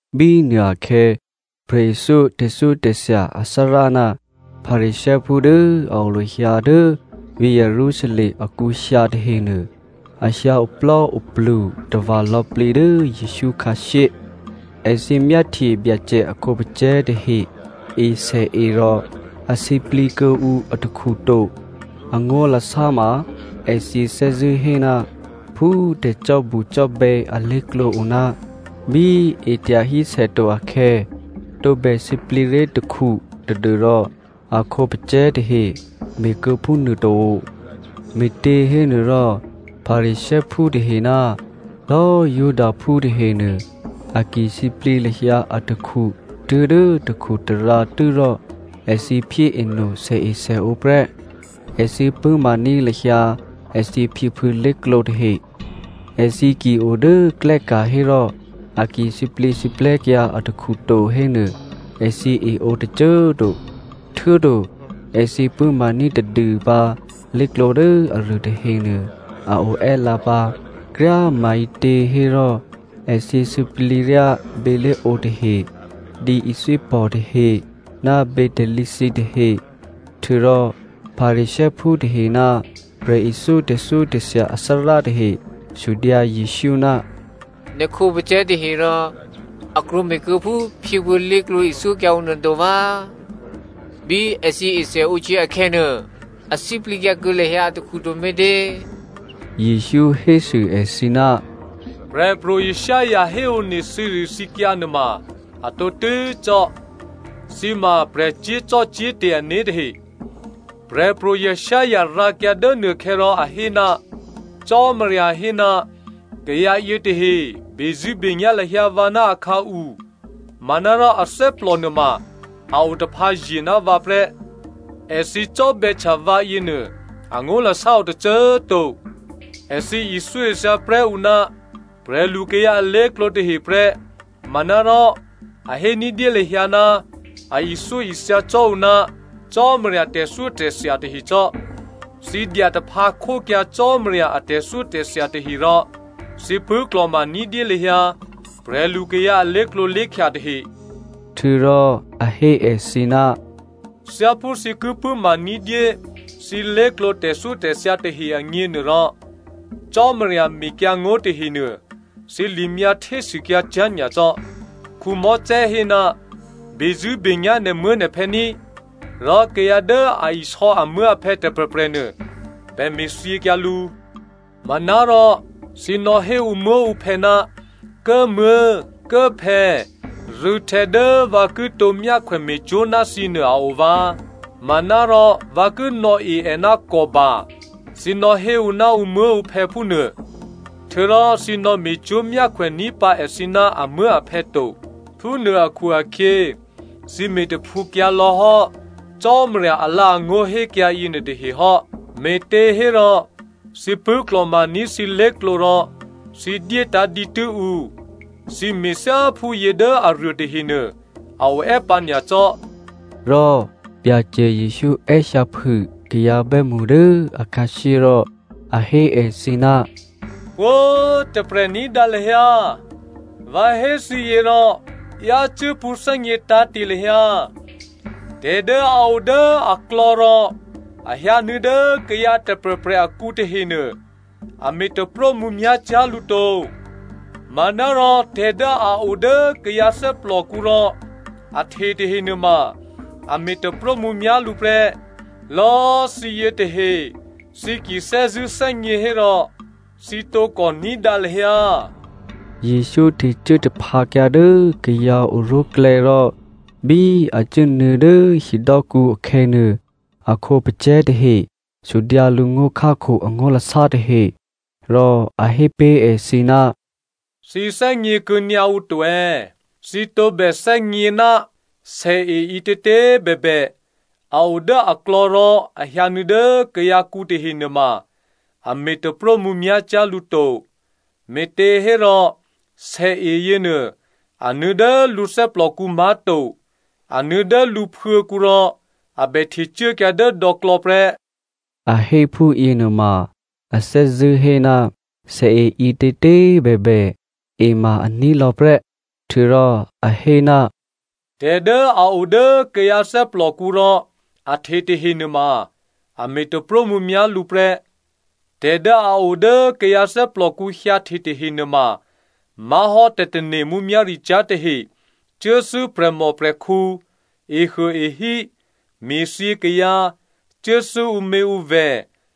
Bínuô akhè̌ prè̤ithyó tè̤thyótè̤thya athárá ná Pharisěophú dố a o lahyǎ dố vǐ̤ Jerusalem akǔ hyǎ tahenuô, a hyǎ oplò́oplu tava̤ lò̌plǐ dố Jesǔ khǎshyé. Èthǐ myáhtye Byacè a khǒpacè̤̌ tahe esèe rò a sǐplǐ kuô̌ǔ atakhu to. Angó̤lasá ma èthǐ thè́zṳ̂́ hé ná phú tè̤cò́bucò́bè̌ alé̤klǒ o ná bí e tyahí sè to akhè̌ tǒbè sǐplǐ ré̤ takhu tadû́rò a khǒpacè̤̌ tahe me̤kuô̌ phúnuô to. (Me̤těhénuôrò Pharisěophú tahe ná lò̌꤮ Judaphú tahenuô a ki sǐplǐ lahyǎ atakhu tuố̤dố takhutarǎ tû́rò èthǐ phyéeno sèesèǒ prè́, èthǐ pṳ̂́maní̤ lahyǎ èthǐ phyěphuô̌ lé̤klǒ tahe. Èthǐ ki o dố klè́ ka̤ hérò a ki sǐplǐsǐplè̤́kyǎ atakhu to hénuô, èthǐ eǒ tôcô꤮ to. Htuô̌to èthǐ pṳ̂́maní̤ tadûpǎ lé̤klǒ dố aruô tahenuô a o è́lǎ pǎ. Kryá꤮ maǐtě hérò, èthǐ sǐplǐ ryá bělé̤ǒ tahe, dǐithwípò̤ tahe, ná bětalǐ thǐtahe.) Htuô̌rò Pharisěophú tahe ná prè̤ithyó tè̤thyótè̤thya athárá tahe sudyǎ Jesǔ, “Nè̤ khǒpacè̤̌ tahe rò a krwǒme̤ kuô̌ phú phyěphuô̌ lé̤klǒ ithyókyǎ ǔ nuô to vǎ? Bí èthǐ esèǒhtyě akhè̌nuô, a sǐplǐkyǎ kuô̌ lahyǎ atakhu to me̤tě?” Jesǔ hésû èthǐ, “Prè̤pro̤ Isaiah héone thǐrithǐkyǎ nuôma a tǒtû́ cò́. Thǐ ma prè̤ cyé̤zò́cò́te̤ ané̤ tahe. Prè̤pro̤ Isaiah rǎkyǎ dố nuôkhè̌ rò a hé, Cò́marya hé, ‘Kayǎ yětahe bezṳ̂́benyá̤ lahyǎ vǎ ná akhǎu manárò athè́plò nuôma a otaphǎye̤ ná vǎ prè́. Èthǐ cò́bè̌htya vǎ yěnuô angó̤lasá o tôcô꤮ to. Èthǐ ithyóithya prè́ ǔ ná prè̤lukayǎ alé̤klǒ tahe prè́ manárò a hé ní̤dyé lahyǎ ná a ithyóithya cò́ ǔ ná Cò́marya a tè̤thyótè̤thya tahecò́.’ “Thǐ dyataphǎ khókyǎ Cò́marya a tè̤thyótè̤thya tahe rò thǐ pṳ̂́klò̤ma ní̤dyé lahyǎ prè̤lukayǎ a lé̤klǒlé̤khya tahe.” Htuô̌rò a hé èthǐ, “Thyáphú thǐ ki pṳ̂́ma ní̤dyé thǐ lé̤klǒ tè̤thyótè̤thya tahe agněnuôrò, Cò́marya mekyǎngó̤ tahenuô, thǐ limyǎ htésûkyǎ cyá̤ nyacò́. Mosè hé, ‘Bezṳ̂́benyá̤ nè̤muố̤nè̤phè̌ ní,’ rò ‘Kayǎ dố a isò̌ amuố̤aphè̌ tôprè̤prè̤nuô bè me̤thyěkyǎ lǔ.’ Manárò thǐ nò̌hé ǔmuố̤ǔphè̌, ‘Kố꤮ muố̤, Kố꤮ phè̌, rû̌htè̌ dố vǎ kitǒ myákhwè me̤cwó̤ ná thǐnuô a o vǎ, manárò vǎ ki nò̌e è ná Kòban,’ thǐ nò̌hé ǔ ná ǔmuố̤ǔphè̌ phúnuô, htuô̌rò thǐ nò̌me̤cwó̤ myákhwèní̤ pǎ èthǐ ná amuố̤aphè̌ to. Phúnuô akhu-akhyě thǐ me̤taphǔkyǎlò̌ hò́ Cò́marya alǎ̤angó̤ hékyǎ yěnuôtahe hò́, me̤těhérò thǐ pṳ̂́klò̤maní̤ thǐ lé̤klǒ rò thǐ dyétǎ̤ dǐtû́ ǔ. Thǐ me̤thyá phúyě dố aruô tahenuô a o è́pǎ nyacò́.” Rò Byacè Jesǔ è́hyǎphû kayǎ bè́mṳ dố akhǎshyé rò a hé èthǐ, “Pwǒ̤꤮ tôprè̤ ní̤dǎ lahyǎ vǎ hé thǐyě rò yácû́ pṳ̌thè́gně tǎ̤te̤ lahyǎ. Tè̤ dố a o dố aklò̌ rò a hyǎnuô̌ dố kayǎ tôprè̤prè̤ akǔ tahenuô a me̤ taprómǔmyá̤ cyá̤ lǔ to, manárò tè̤ dố a o dố kayǎ thè́plòkǔ rò a hte tahe nuôma a me̤ taprómǔmyá̤ lǔ prè́.” (“Lò̌꤮ thǐ yětahe, thǐ ki thè́zṳ̂́ thè́gně hérò, thǐ tǒkò ní̤dǎ lahyǎ.”) Jesǔ htecuố taphǎkyǎ dố kayǎ oró̤klè̌ rò bí a cuốnuô̌ dố hidò́kǔ akhè̌nuô, a khǒpacè̤̌ tahe sudyǎ lǔ ngó̤khákho angó̤lasá tahe. Rò a hé pé̤ èthǐ, “Thǐ thè́gně kuô̌nyǎ ǔ to è̌? Thǐ tǒbè thè́gně, sèe ǐtětě꤮ bèbè, a o dố aklò̌ rò a hyǎnuô̌ dố kayǎkǔ tahe nuôma, a me̤ taprómǔmyá̤ cyá̤ lǔ to. Me̤těhérò sèe yěnuô, a nuô̌ dố lǔ thè́plòkǔ má̤to, a nuô̌ dố phuô̤̌kǔ rò a bè htecuốkyǎ dố dò̌klò̌ prè́.” (A hé phúyěnuôma, a thè́zṳ̂́ hé, sèe ǐtětě꤮ bèbè, e ma a ní̤ lò̌prè́.) Htuô̌rò a hé, “Tè̤ dố a o dố kayǎ thè́plòkǔ rò a hte tahe nuôma a me̤ taprómǔmyá̤ lǔ prè́. Tè̤ dố a o dố kayǎ thè́plòkǔ hyǎhte tahe nuôma má̤hò́ tè̤tane̤ mǔmyá̤ricyá̤ tahe, cuốthû́ prè̤mòprè̤khǔ, ehuôehí, me̤thyě kayǎ, cuốthû́ ǔměǔvè̤,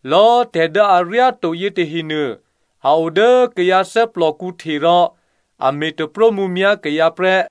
Lò̌꤮ tè̤ dố aryáto yětahenuô a o dố kayǎ thè́plòkǔ hte rò a me̤ taprómǔmyá̤ kayǎ prè́.”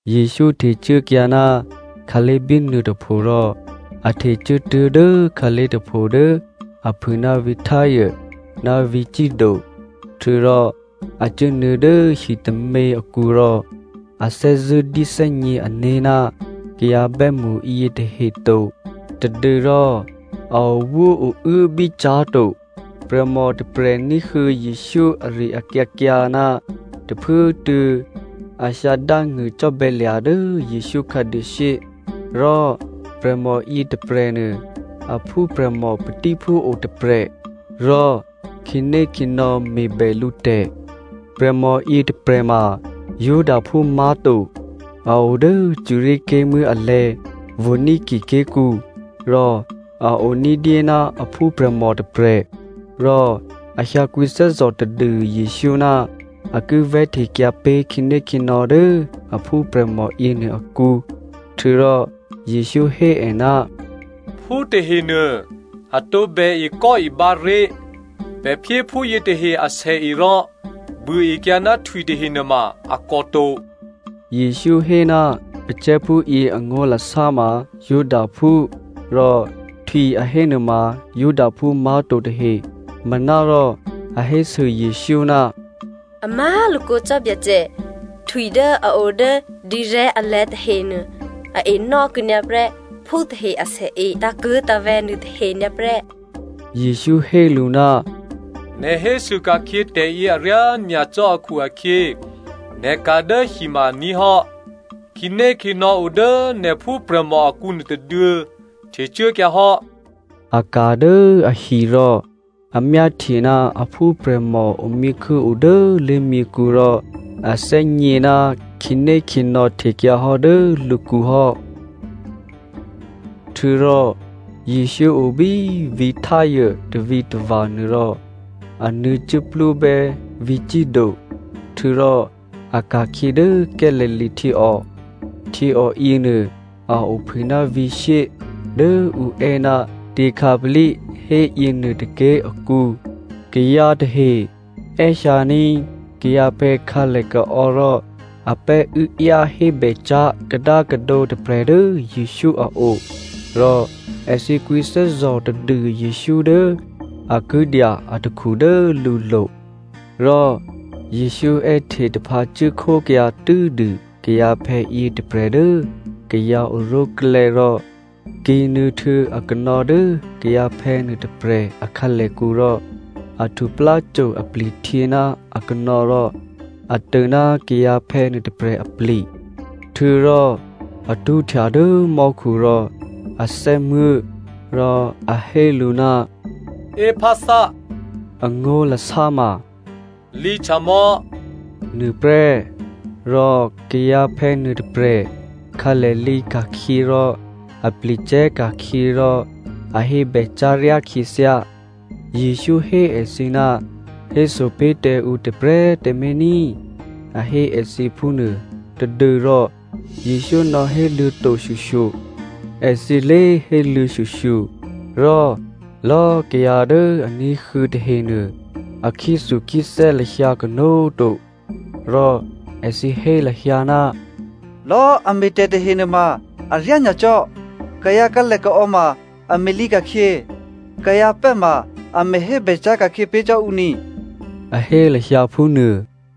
Jesǔ htecuốkyǎ ná khǎlé̤ bínuôtôpho rò a htecuốtuố̤ dố khǎlé̤ tôpho dố aphû ná vǐ̤ Tyre ná vǐ̤ Sido. Htuô̌rò a cuốnuô̌ dố hitômě akǔ rò a thè́zṳ̂́ dyéthè́gně ané̤ ná kayǎ bè́mṳ yětahe to tadû́rò a owóouố bícyá̤ to. Prè̤mò tôprè̤ ní̤huô̌ Jesǔ ari-akyǎkyǎ ná tôphuốtuô̌ a hyǎ dángṳ̂cò́bè̌lya̤ dố Jesǔ khǎduôshyé. Rò prè̤mò yětôprè̤nuô a phúprè̤mò patíphú o tôprè̤ rò khǐnékhǐnò̌ me̤bè lǔ tè̤. Prè̤mò yětôprè̤ ma Judaphú má̤to, a o dố Syria ké̤muố̤ alè̤̌ Phonicia ké̤kǔ, rò a o ní̤dyé ná a phúprè̤mò tôprè̤. Rò a hyǎ kwǐthè́zò̤ tadû Jesǔ ná a ki vè̤́htekyǎ pé̤ khǐnékhǐnò̌ dố a phúprè̤mò yěnuô akǔ. Htuô̌rò Jesǔ hé è, “Phú tahenuô a tǒbè ekò́ǒbǎ ré̤, pè̤ phyé phú yětahe asèe rò buôekyǎ ná htwi tahe nuôma a kòto.” (Jesǔ hé ná pacè̤̌phúyě angó̤lasá ma Judaphú rò htwi a hé nuôma Judaphú má̤to tahe.) Manárò a hésû Jesǔ, “A má̤lakǒ cò́ Byacè, htwi dố a o dố dǐrè̤́ alè̤̌ tahenuô a enò́ kuô̌nyǎprè́ phú tahe asèe tǎ̤kuố̤tǎ̤vè̤̌ nuôtahe nyǎprè́.” Jesǔ hé lǔ, “Nè̤ hésû ka̤khyě tè̤yě aryá nyacò́ akhu-akhyě nè̤ ka̤ dố hi ma aní̤ hò́. Khǐnékhǐnò̌ o dố nè̤ phúprè̤mò akǔ nuôtôduô̌ htecuốkyǎ hò́.” A ka̤ dố ahi rò a myáhtye ná a phúprè̤mò omyěkhû́ o dố lé̤myěkhu rò a thè́gně ná khǐnékhǐnò̌ htekyǎhò́ dố lǔkǔ hò́. Htuô̌rò Jesǔ o bí vǐ̤ Tyre tavǐtava̤ nuô rò a nuô̌ cuốplúbè́ vǐ̤ Sido, htuô̌rò a ka̤khyě dố Galilea htyěò. Htyěò yěnuô a ophû ná vǐ̤ shyé dố ǔ è́ ná Decapoli hé yěnuô tôké̤ akǔ. Kayǎ tahe è́hyǎní̤ kayǎphè̌ khǎlèkaò̌ rò a pè́ uốáyá hébè cyá̤ kadákadǒ tôprè̤ dố Jesǔ a o rò èthǐ kwǐthè́zò̤ tadû Jesǔ dố a ki dya atakhu dố lǔlo̤. Rò Jesǔ è́hte taphǎcuốkhókyǎ tû́dû kayǎphè̌ yětôprè̤ dố kayǎ oró̤klè̌ rò kǐ̤nuô̌ htuô̌ akanò̌ dố kayǎphè̌ nuôtôprè̤ a khǎlèkǔ rò a htupláco apli̤htyě ná akanò̌ rò a tô ná kayǎphè̌ nuôtôprè̤ apli̤. Htuô̌rò a tṳ́htya dố mò́khu rò a thè́muố̤, rò a hé lǔ, “Éphatha!” Angó̤lasá ma “lǐhtyamò̌!” nuôprè́. Rò kayǎphè̌ nuôtôprè̤ khǎlè lǐka̤khyě rò apli̤ cè̤́ ka̤khyě rò a hébè cyá̤ ryá khyěthyá. Jesǔ hé èthǐ ná héso pé̤ tǎ ǔ tôprè̤꤮ tǎmé̤ ní꤮, a hé èthǐ phúnuô tadû́rò Jesǔ nò̌héluô̌ to shyoshyo, èthǐ lé héluô̌ shyoshyo. Rò lò̌꤮ kayǎ dố a ní̤huô̌ tahenuô, a khyéthukhyéthè́ lahyǎ kanó̤꤮ to. Rò èthǐ hé lahyǎ, “Lò̌꤮ è me̤tè̤ tahe nuôma aryá nyacò́! Kayǎ khǎlèkaò̌ ma a me̤lǐka̤khyě, kayǎ pè́ ma a me̤hébè cyá̤ ka̤khyě pé̤ cò́ ǔ ni,” a hé lahyǎ phúnuô.